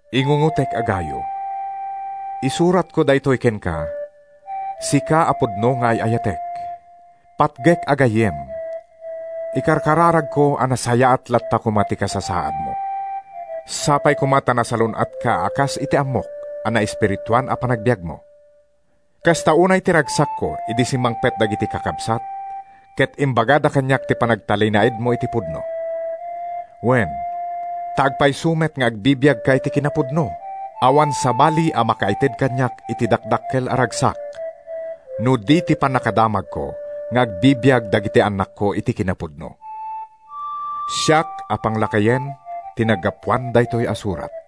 Ingungotek a Gayo: Isuratko daytoy kenka, sika a pudno nga ay-ayatek. Patgek a gayyem, ikarkararagko a nasayaat latta koma ti kasasaadmo. Sapay koma ta nasalun-atka a kas iti ammok a naespirituan a panagbiagmo. Kasta unay ti ragsakko idi simmangpet dagiti kakabsat ket imbagada kaniak ti panagtalinaedmo iti pudno. Wen, ta agpayso met nga agbibiagka iti kinapudno. Awan sabali a makaited kaniak iti dakdakkel a ragsak, no di ti pannakadamagko nga agbibiag dagiti annakko iti kinapudno. Siak a Panglakayen ti naggapuan daytoy a surat.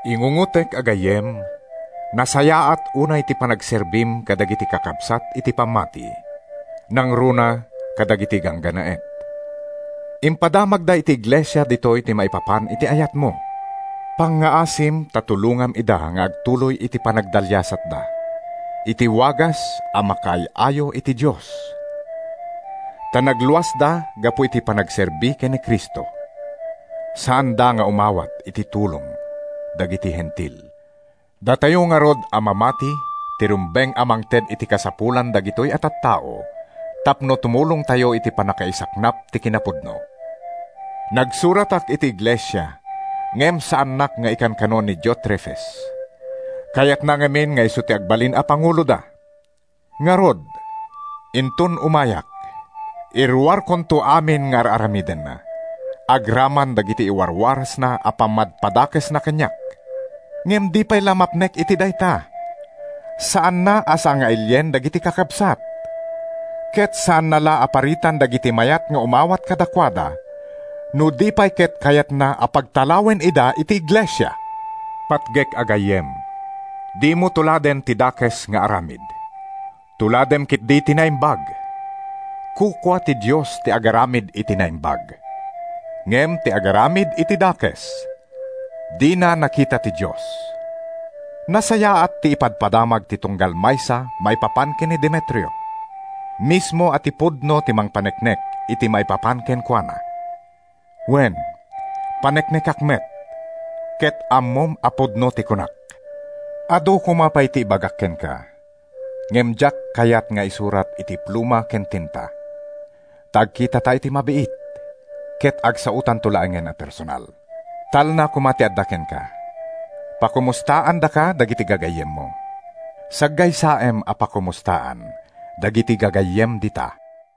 Ingungotek a gayyem, nasayaat unay ti panagserbim kadagiti kakabsat iti pammati, nangruna kadagiti ganggannaet. Impadamagda iti iglesia ditoy ti maipapan iti ayatmo. Pangngaasim ta tulongam ida nga agtuloy iti panagdaliasatda, iti wagas a makaay-ayo iti Dios. Ta nagluasda gapu iti panagserbi ken ni Cristo. Saanda nga umawat iti tulong dagiti Hentil. Datayo ngarud a mamati ti rumbeng a mangted iti kasapulan dagitoy a tattao tapno tumulongtayo iti pannakaisaknap ti kinapudno. Nagsuratak iti iglesia, ngem saannak nga ikankano ni Diotrefes. Kayatna ngamin nga isu ti agbalin a panguloda. Ngarud, inton umayak, iruarkonto amin nga ar-aramidenna, agraman dagiti iwarwarasna a pammadpadakesna kaniak. Ngem di pay la mapnek iti dayta. Saanna a sangailien dagiti kakabsat, ket saanna la a paritan dagiti mayat nga umawat kadakuada, no di pay ket kayatna a pagtalawen ida iti iglesia! Patgek a gayyem, dimo tuladen ti dakes nga aramid. Tuladem ketdi ti naimbag. Kukua ti Dios ti agaramid iti naimbag. Ngem ti agaramid iti dakes, dina nakita ti Dios. Nasayaat ti ipadpadamag ti tunggal maysa maipapan ken ni Demetrio. Mismo a ti pudno ti mangpaneknek iti maipapan kenkuana. Wen, paneknekak met, ket ammom a pudno ti kunak. Adu koma pay ti ibagak kenka, ngem diak kayat nga isurat iti pluma ken tinta, ta agkitata iti mabiit, ket agsaotanto laengen a personal. Talna koma ti adda kenka. Pakumostaandaka dagiti gagayyemmo. Saggaysaem a pakomustaan dagiti gagayyem dita.